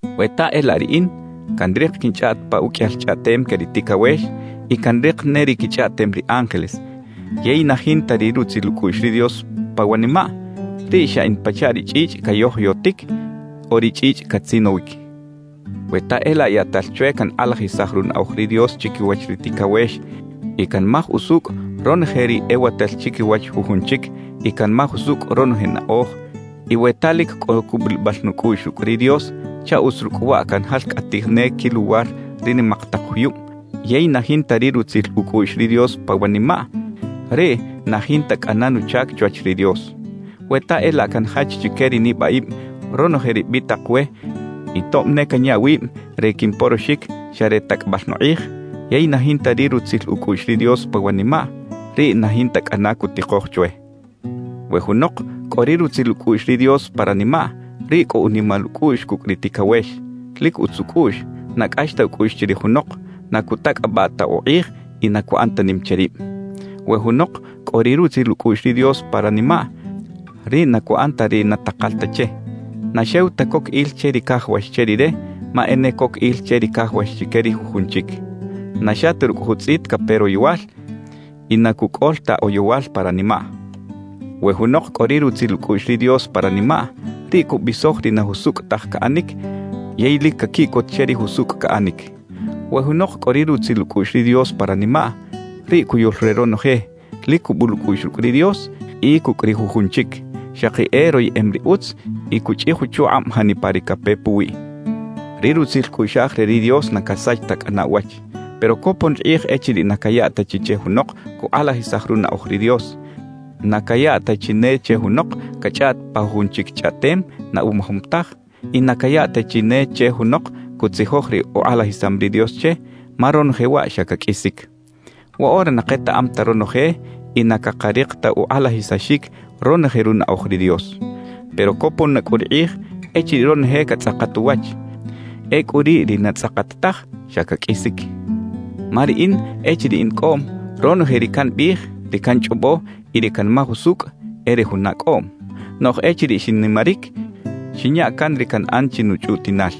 We ta e laꞌ riꞌin canrik quinchꞌaꞌt pa uqꞌuiyal chꞌaꞌtem que ri ticawex y canrik ne ri quichꞌaꞌtem ri ángeles yey na jinta ri rutzil ucꞌuꞌx ri Dios pa wanimaꞌ, riꞌ xa in pachaꞌ ri chꞌichꞌ cayojoyotic o ri chꞌichꞌ catzinowic. We ta e laꞌ yaꞌtal chwe cankꞌalajisaj runaꞌoj ri Dios chiquiwach ri ticawex y canmaj usucꞌ ronoje ri ewatal chiquiwach jujun chic y canmaj usucꞌ ronoje naꞌoj, y we ta lic cꞌo cubulibal nucꞌuꞌx rucꞌ ri Dios chaꞌ utz rucꞌ waꞌ canjalcꞌatij ne quiluwar ri nimak tak juyub, yey na jinta ri rutzil ucꞌuꞌx ri Dios pa wanimaꞌ, riꞌ na jinta cꞌana nuchac chwach ri Dios. We ta e laꞌ canjach chique ri nibaꞌib ronoje ri bitak we y tob ne canya wib re quimporoxic xa re tacꞌabal nukꞌij, yey na jinta ri rutzil ucꞌuꞌx ri Dios pa wanimaꞌ, riꞌ na jinta cꞌana cutikoj chwe. We junok cꞌo ri rutzil ucꞌuꞌx ri Dios pa ranimaꞌ, riꞌ cꞌo unimal ucꞌuꞌx cucꞌ ri ticawex, lic utz ucꞌuꞌx, na cꞌax ta ucꞌuꞌx chirij junok, na cutacꞌabaꞌ ta ukꞌij y na cuꞌan ta nim che rib. We junok cꞌo ri rutzil ucꞌuꞌx ri Dios pa ranimaꞌ, riꞌ na cuꞌan ta ri na takal ta che. Na xew ta coc il che ri cajawax che rire, ma e ne coc il che ri cajawax chique ri jujun chic. Na xa ta rucꞌ jutzꞌit cape royowal y na cucꞌol ta oyowal pa ranimaꞌ. We junok cꞌo ri rutzil ucꞌuꞌx ri Dios pa ranimaꞌ, riꞌ cubisoj ri na jusucꞌ taj caꞌanic yey lic caquiꞌcot che ri jusucꞌ caꞌanic. We junok cꞌo ri rutzil ucꞌuꞌx ri Dios pa ranimaꞌ, riꞌ cuyul re ronoje, lic cubul ucꞌuꞌx rucꞌ ri Dios y cucꞌ ri jujun chic, xaki e royeꞌem ri utz y cuchꞌij uchukꞌab janipa ri cape puwiꞌ. Ri rutzil cꞌuꞌxaj re ri Dios na casach ta cꞌana uwach. Pero copon ri kꞌij echiriꞌ na cayaꞌ ta chi che junok cukꞌalajisaj runaꞌoj ri Dios, na cayaꞌ ta chi ne che junok cachꞌaꞌt pa jujun chic chꞌaꞌtem na umajom taj y na cayaꞌ ta chi ne che junok cutzijoj ri ukꞌalajisam ri Dios che; ma ronoje waꞌ xa caqꞌuisic. Woꞌora na ketaꞌam ta ronoje y na cakarik ta ukꞌalajisaxic ronoje runaꞌoj ri Dios. Pero copon na cꞌu ri kꞌij echiriꞌ ronoje catzꞌakat uwach; ecꞌu riꞌ ri na tzꞌakat taj, xa caqꞌuisic. Ma riꞌin echiriꞌ in cꞌoꞌm, ronoje ri cambiꞌij, ri canchꞌobo y ri canmaj usucꞌ e re juna cꞌoꞌm. Noꞌj echiriꞌ xinnimaric, xinya can ri canꞌan chi nuchꞌutiꞌnal.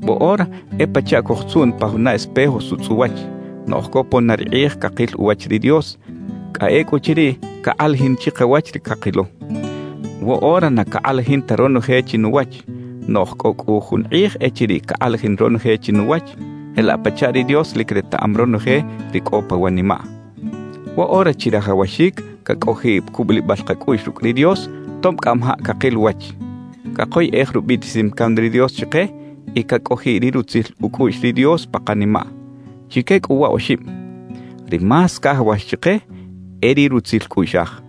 Woꞌora e pachaꞌ cojtzuꞌn pa juna espejo sutzꞌ uwach; noꞌj copon na ri kꞌij cakil uwach ri Dios, cꞌa ecꞌuchiriꞌ cakꞌalajin chikawach ri cakilo. Woꞌora na cakꞌalajin ta ronoje chinuwach; noꞌj cꞌo cꞌu jun kꞌij echiriꞌ cakꞌalajin ronoje chinuwach, jelaꞌ pachaꞌ ri Dios lic retaꞌam ronoje ri cꞌo pa wanimaꞌ. Woꞌora chirajawaxic cacꞌojiꞌ cubulibal kacꞌuꞌx rucꞌ ri Dios tob cꞌamajaꞌ cakil uwach, cakoyꞌej rubiꞌtisim can ri Dios chike y cacꞌojiꞌ ri rutzil ucꞌuꞌx ri Dios pa kanimaꞌ. Chique cꞌu wa oxib, ri más cajawax chike e ri rutzil cꞌuꞌxaj.